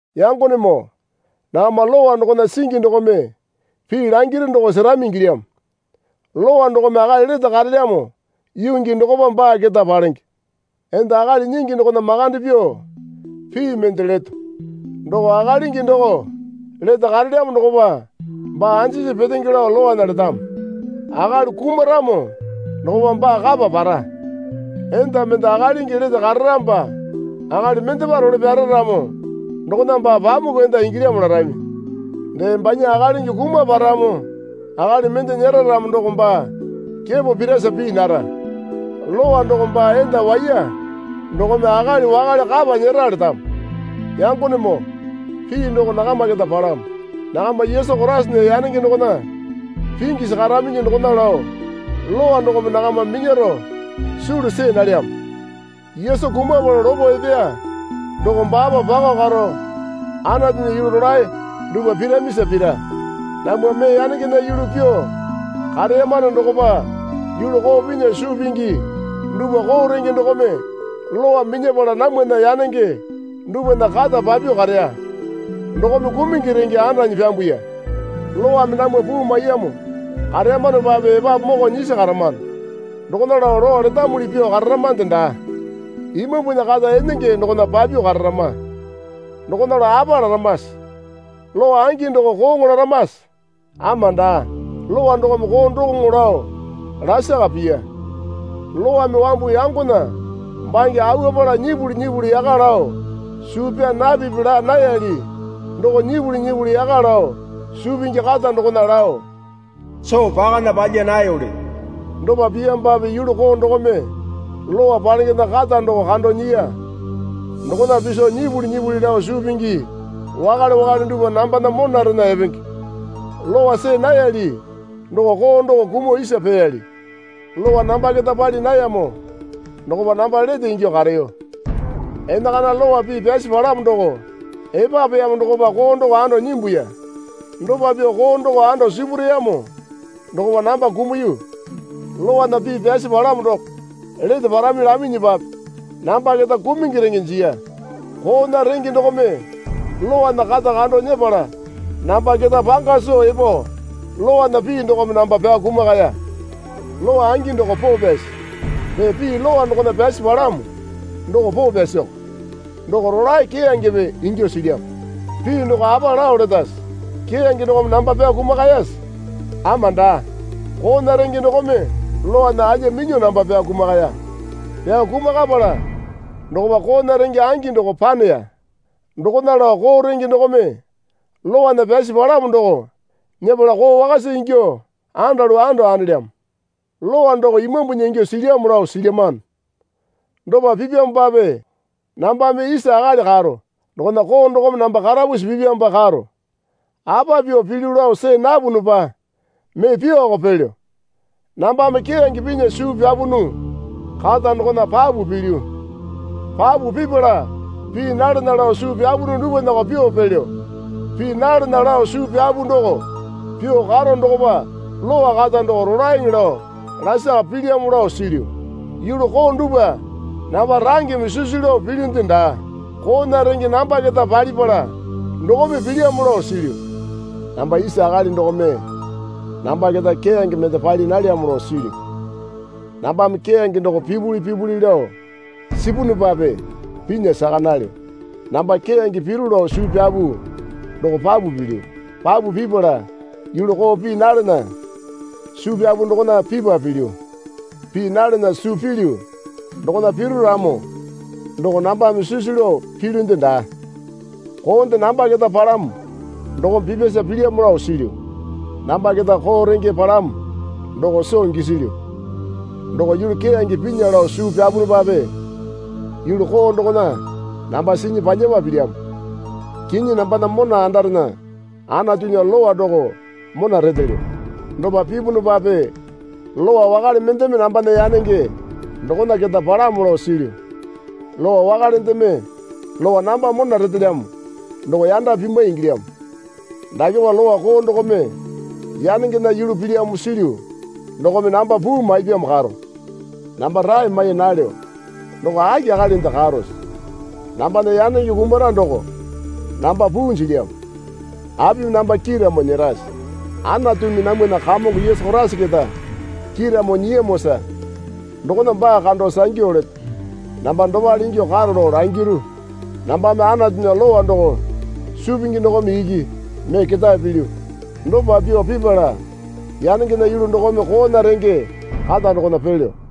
Yangonemoo, nakama lowa dokona singi dokome pii langiru doko serami ingilyamo. Lowa dokome akali lete karelyamo yuu gii dokopa baa keta palenge. Enda akali nyingi dokona makande pyuo pii mende leto. Doko akalingi doko lete karelyamo dokopa baa anjisi petenge lao lowana letamo. Akali kumaramo dokopa baa kapa para. Enda mende akalingi lete kararamopa akali mendepa role pyara ramo dokona baa pamuku enda ingilyamo larami. Dee banya akalingi kumaparamo akali mende nyera ramo doko baa kepo pirasa pii nara. Lowa doko baa enda waiya dokome akali wakale kapa nyera letamo. Yangonemoo, pii doko nakama keta palamo. Nakama Yesu Koraisana yanenge dokona pingyasi karaminyi dokona lao Lowa dokome nakama minyaro sulu see nalyamo. Yesu kumapala lopo epeya doko baapa pakao karo Anatunya yulu rolae dupwa piramasa pira. Namwa mee yanengena yulu pyuo kareyamano dokopa yulu koo pinya suu pingi dupwa koo renge dokome Lowa minyapala namwana yanenge dupwana kata papyuo kareya. Dokome kumungi renge andanyi pyambuya. Lowame namwa puu maiyamo kareyamanopape epapu moko nyisi karamano. Dokona lao lowa letamuli pyuo kararamande daa. Imambunya kata enenge dokona pyuo kararama. Dokona lao apa laramase? Lowa angi doko kooŋo laramase? Ama daa. Lowa dokome koo dokoŋo lao lasaka piya. Lowame wambu yangona bange awuapala nyipuli nyipuli yaka lao suu pyaa napipi laa nayali doko nyipuli nyipuli yaka lao suu pingi kata dokona lao soo pakana palya nayoli. Dopa piyamopape yulu doo dokome lowa palengena kata doko kando nyiya. Dokona piso nyipuli nyipuli lao suu pingi wakale wakale dupwa nambana monarena epenge. Lowa see nayali doko koo doko kumuo isa peyali. Lowa namba keta pali nayamo dokopa namba lete ingyuo kareyo. Enakana Lowa pii pyasi palamo doko epapeyamo dokopa koo doko ando nyimbuya. Dopa pyuo koo doko ando sipureyamo dokopa namba kumuyu. Lowana pii pyasi palamo doko lete parami laminyipape namba keta kumungi renge jiya. Koona renge dokome lowana kata kando nyepala namba keta panga soo epo lowana pii dokome namba pyao kumakaya. Lowa angi doko poo pyasi. Dee pii lowa dokona pyasi palamo doko poo pyasioko doko rolae keyangepe ingyuo silyamo. Pii doko apa lao letase? Keyange dokome namba pyao kumakayase? Ama daa. Koona renge dokome lowana alya minyuo namba pyao kumakaya. Pyao kumakapala dokopa koona renge angi doko paneya. Dokona lao koo renge dokome lowana pyasi palamo doko nyepala koo wakasa ingyuo andalu ando andelyamo. Lowa doko Imambunya ingyuo silyamo lao silyamano. Dopa pipyamopape namba mee isa akali karo dokona koo dokome namba karapusi pipyamopa karo. Apa pyuo pilyu lao see napunupa mee pyuoko pelyo. Nambame keyange pinya suu pyapunu kata dokona papu pilyu. Papu pipala pii nalana suu pyapunu dupwanako pyuo pelyo. Pii nalana lao suu pyapu doko pyuo karo dokopa Lowa kata doko rolaeŋe lao lasaka pilyamo lao silyu. Yulu koo dupwa namba rangeme sisu lao pilyunde daa. Koona renge namba keta palipala dokome pilyamo lao silyu. Namba isa akali dokome namba keta keyange mende pali nalyamo lao silyu. Nambame keyange doko pipuli pipuli lao sipunupape pinya saka nalyo. Namba keyange piru lao suu pyapu doko papu pilyu. Papu pipala yulu koo pii nalana suu pyapu dokona pipa pilyu. Pii nalana suu pilyu dokona piru ramo doko nambame sisu lao pilyunde daa. Koonde namba keta palamo dokome pipyasa pilyamo lao silyu. Namba keta koo renge palamo doko soo gisilyu. Doko yulu keyange pinya lao suu pyapunupape yulu koo dokona namba sinyi palyapa pilyamo. Kinyi nambana mona andarena Anatunya lowa doko mona retelyo. Dopa pipunupape lowa wakale mendeme nambana yanenge dokona keta palamo lao silyu. Lowa wakalendeme lowa namba mona retelyamo doko yanda pimwai ingilyamo. Dakepa lowa koo dokome yanengena yulu pilyamo silyu dokome namba puu maipyamo karo. Namba rae mai nalyo. Doko aki akalinde karose? Nambana yanenge kumara doko namba puu jilyamo. Apimi namba kiiramo nyerase? Anatumi namwana Kamongo Yesu Koraisa keta kiiramo nyiyamosa dokona baa kando sangyu leto. Namba dopale ingyuo karo lao langiru. Nambame Anatunya lowa doko suu pingi dokome iki mee ketae pilyu. Dopa pyuo pipala yanengena yulu dokome koona renge kata dokona pelyo.